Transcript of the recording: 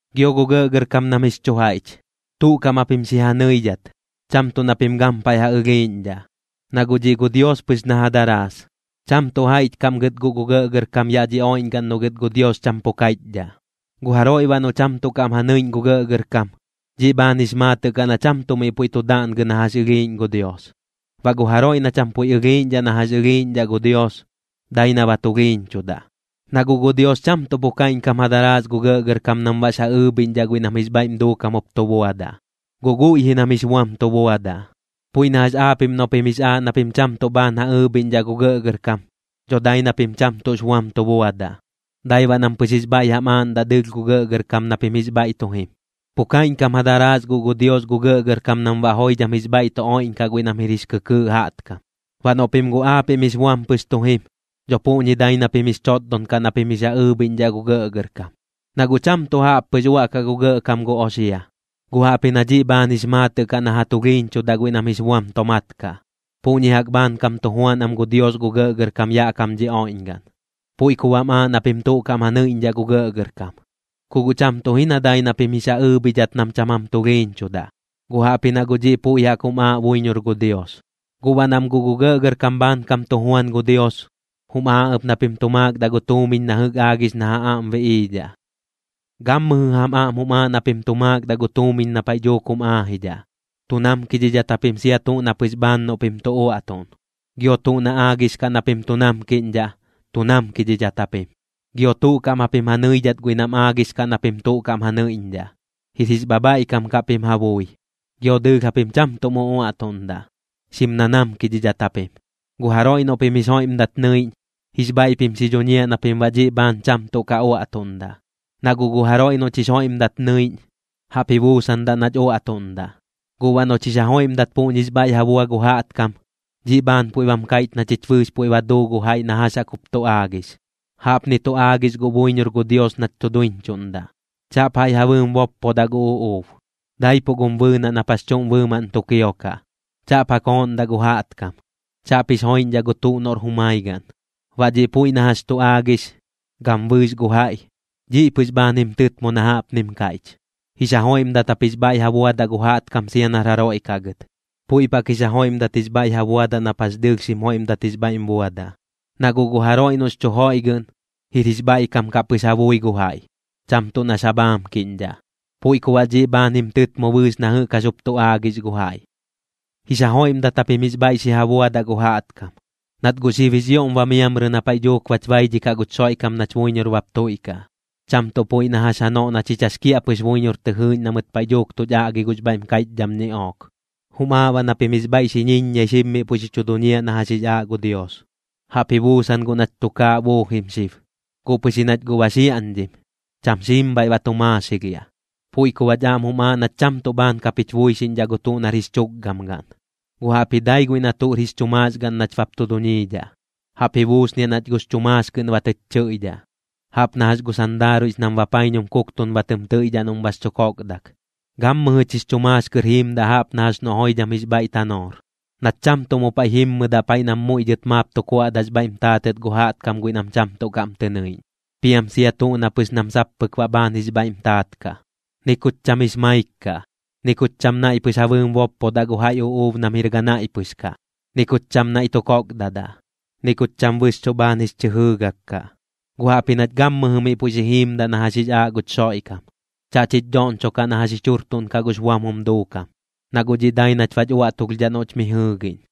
Gio gu gɇꞌgɇrkam nam jix chu jaiꞌch, tuꞌ kaꞌm japim xi ja nɨidhat, cham tuꞌ na pim gampaiꞌ ja ɨlhiiꞌñdhaꞌ, na guꞌ dhiꞌ gu Dios pɨx na ja daraas. Cham tuꞌ jaiꞌch kaꞌm gɨt guꞌ gu gɇꞌgɇrkam yaꞌ dhi oiꞌñgaꞌn noꞌ gɨt gu Dios cham pu kaiꞌchdhaꞌ. Gu jaroiꞌ baꞌ noꞌ cham tuꞌ kaꞌm ja nɨiꞌñ gu gɇꞌgɇrkam, dhiꞌ bhaan jix maatɨꞌ kaꞌ na cham tuꞌ miꞌ puiꞌ tu daꞌngɨ na jax ɨlhiiꞌñ gu Dios. Baꞌ gu jaroiꞌ na cham puiꞌ ɨlhiiꞌñdhaꞌ na jax ɨlhiiꞌñdhaꞌ gu Dios, dai na ba tulhiiñchudaꞌ. Na guꞌ gu Dios cham tuꞌ pu kaiꞌñkam ja daraas gu gɇꞌgɇrkam nam baꞌx ja ɨɨbhiꞌñdhaꞌ guiꞌ nam jix bhaiꞌm duukam jup tu buadaꞌ, guꞌ guiꞌ ji nam jix buam tu buadaꞌ. Puiꞌ na jax aapiꞌm noꞌ pim jix aaꞌ na pim cham tuꞌ bhaan ja ɨɨbhiꞌñdhaꞌ gu gɇꞌgɇrkam, dho dai na pim cham tuꞌx buam tu buadaꞌ, dai baꞌ nam pɨx jix bhaiꞌ jam aaꞌndaꞌ dɨɨlh gu gɇꞌgɇrkam na pim jix bhaiꞌ tu jim. Pu kaiꞌñkam ja daraas guꞌ gu Dios gu gɇꞌgɇrkam nam baꞌ joidham jix bhaiꞌ tu oiꞌñkam guiꞌ nam jir jix kɨkɨɨꞌ jaꞌtkam. Baꞌ noꞌ pim guꞌ aapiꞌm jix buam pɨx tu jim, dho puꞌñi dai na pim jix chotdon kaꞌ na pim jix ja ɨɨbhiꞌñdhaꞌ gu gɇꞌgɇrkam. Na guꞌ cham tuꞌ jaꞌp pɨx uaꞌkaꞌ gu gɇꞌkam gu oxia, guꞌ jaꞌpji na dhiꞌ bhaan jix maatɨꞌ kaꞌ na ja tulhiiñchudaꞌ guiꞌ nam jix buam tomaat kaꞌ. Puꞌñi jaꞌk bhaankam tu juan am gu Dios gu gɇꞌgɇrkam yaꞌ kam dhi oiꞌñgaꞌn. Puiꞌ ku baꞌm aaꞌ na pim tuꞌ kaꞌm ja nɨiꞌñdhaꞌ gu gɇꞌgɇrkam, ku guꞌ cham tuꞌ ji na dai na pim jix ja ɨɨbhidhat nam cham jam tulhiiñchudaꞌ, guꞌ jaꞌpji na guꞌ dhiꞌ puiꞌ jaꞌk jum aaꞌ buiñor gu Dios. Guꞌ baꞌ nam guꞌ gu gɇꞌgɇrkam bhaankam tu juan gu Dios, jum aaꞌ ɨp na pim tu maakdaꞌ gu tuumiñ na jɨꞌk aagix na ja aꞌm biꞌiidhaꞌ. Gammɨjɨ jam aꞌm jum aaꞌ na pim tu maakdaꞌ gu tuumiñ na paiꞌ dhuuk jum aajidhaꞌ. Tu namkidhidhat japim sia tuꞌ na pɨx bhaan noꞌ pim tu uaꞌtuꞌn. Gio tuꞌ na aagix kaꞌ na pim tu namkiꞌñdhaꞌ, tu namkidhidhat japim. Gio tuꞌ kaꞌm japim ja nɨidhat guiꞌ nam aagix kaꞌ na pim tuꞌ kaꞌm ja nɨiꞌñdhaꞌ, jir jix bhabhaiꞌkam kaꞌ pim ja bui. Gio dɨɨlh japim cham tuꞌm uꞌuaꞌtuꞌndaꞌ, xim nanamkidhat japim. Gu jaroiꞌ noꞌ pim jix joiꞌmdat nɨiꞌñ, jix bhaiꞌ pim xi dhuñiaꞌ na pim baꞌ dhiꞌ bhaan cham tuꞌ ka uaꞌtuꞌndaꞌ. Na guꞌ gu jaroiꞌ noꞌch jix joiꞌmdat nɨiꞌñ, jaꞌp ji buusandaꞌ nach uaꞌtuꞌndaꞌ. Guꞌ baꞌ noꞌch jix ja joiꞌmdat puꞌñix bhaiꞌ ja bua gu jaꞌtkam, dhiꞌ bhaan puiꞌ bam kaiꞌch na chich bɨɨx puiꞌ ba duu gu jaiꞌ na jax jaꞌk jup tu aagix. Jaꞌpni tu aagix guꞌ buiñor gu Dios nach tu duiñchuꞌndaꞌ: “Chaꞌp jaiꞌ ja bɨɨm boppodaꞌ gu uꞌuub, daipuꞌ gum bɨɨnaꞌ nap jax chuꞌm bɨɨmaꞌn tu kiokaꞌ. Chaꞌp ja kooꞌndaꞌ gu jaꞌtkam. Chaꞌp jix joiꞌñdhaꞌ gu tuꞌ noꞌr jumai gaꞌn.” Baꞌ dhiꞌ puiꞌ na jax tu aagix, gam bɨɨx gu jaiꞌ, dhiꞌ pɨx bhaan jim tɨtmo na jaꞌpnim kaiꞌch: “Jix ja joiꞌmdat jap jix bhaiꞌ ja buadaꞌ gu jaꞌtkam sia nar jaroiꞌ kaꞌ gɨt. Puiꞌp jaꞌk jix ja joiꞌmdat jix bhaiꞌ ja buadaꞌ nap jax dɨɨlh xim joiꞌmdat jix bhaiꞌm buadaꞌ.” Na guꞌ gu jaroiꞌ noꞌx chu joiꞌgɨꞌn, jir jix bhaiꞌkam kaꞌ pɨx ja bui gu jaiꞌ, cham tuꞌ nax ja bhaamkiꞌñdhaꞌ. Puiꞌ ku baꞌ dhiꞌ bhaan jim tɨtmo bɨɨx na jɨꞌk jax jup tu aagix gu jaiꞌ. Jix ja joiꞌmdat japim jix bhaiꞌ xi ja buadaꞌ gu jaꞌtkam, nat guꞌ xib jix ioꞌm ba miamrɨ na paiꞌ dhuuk bach baidhikaꞌ guch Xoiꞌkam nach buiñor bap tuiꞌkaꞌ, cham tuꞌ puiꞌ na jax janoꞌ na chich jax kiaꞌpɨx buiñor tɨ jɨɨꞌñ na mɨt paiꞌ dhuuk tuch aꞌgi gux bhaiꞌm kaiꞌchdham ñiꞌook. Jum aaꞌ baꞌ na pim jix bhaiꞌ xi ñiññiai xib miꞌ puiꞌ xi chu duñiaꞌ na jax jix aaꞌ gu Dios. Jaꞌp ji buusan guꞌ nach tukaaꞌ buujim xib, guꞌ pɨx ji nach guꞌ ba xiaꞌñdhim, cham xiim bhaiꞌ ba tu maaxilhiaꞌ. Puiꞌ ku baꞌch aꞌm jum aaꞌ nach cham tuꞌ bhaan kap jich buixiꞌñdhaꞌ gu tuꞌ nar jix chukgam gaꞌn, guꞌ jaꞌpji dai guiꞌ na tuꞌr jix chu maax gaꞌn nach bap tu duñiidhaꞌ. Jaꞌp ji buusniaꞌ nach gux chu maax kɨꞌn ba tɨch chɨiꞌdhaꞌ, jaꞌp na jax gu sandaaruiꞌx nam bapaiñum kuktun ba tɨm tɨiꞌdhaꞌ noꞌm bax chu kokdak. Gammɨjɨch jix chu maax kɨr jiimdaꞌ jaꞌp na jax noꞌ joidham jix bhaiꞌ tanoor, nach cham tuꞌ mu paiꞌ jimmɨdaꞌ paiꞌ nam muiꞌ dhɨt maap tu kuaꞌdaꞌx bhaiꞌm taatɨt gu jaꞌtkam guiꞌ nam cham tuꞌ kaꞌm tɨ nɨiꞌñ, piam sia tuꞌ na pɨx nam sap pɨk baꞌ bhaan jix bhaiꞌm taat kaꞌ. Ni kuch cham jix maik kaꞌ, ni kuch cham naiꞌ pɨx ja bɨɨm boppodaꞌ gu jaiꞌ uꞌuub nam jir ganaiꞌ pɨx kaꞌ, ni kuch cham naiꞌ tu kokdadaꞌ, ni kuch cham bɨxchuꞌ bhaan jix chɨ jɨɨgak kaꞌ. Gu jaꞌpji nach gammɨjɨ miꞌ puiꞌ xi jiimdaꞌ na jax jix aaꞌ guch Xoiꞌkam. Chaꞌch jich dhoꞌñchokaꞌ na jax jich jurtuꞌnkaꞌ gux buam jum duukam, na guꞌ dhiꞌ dai nach bach uaꞌtulhdhaꞌ noꞌch mi jɨɨgiꞌñ.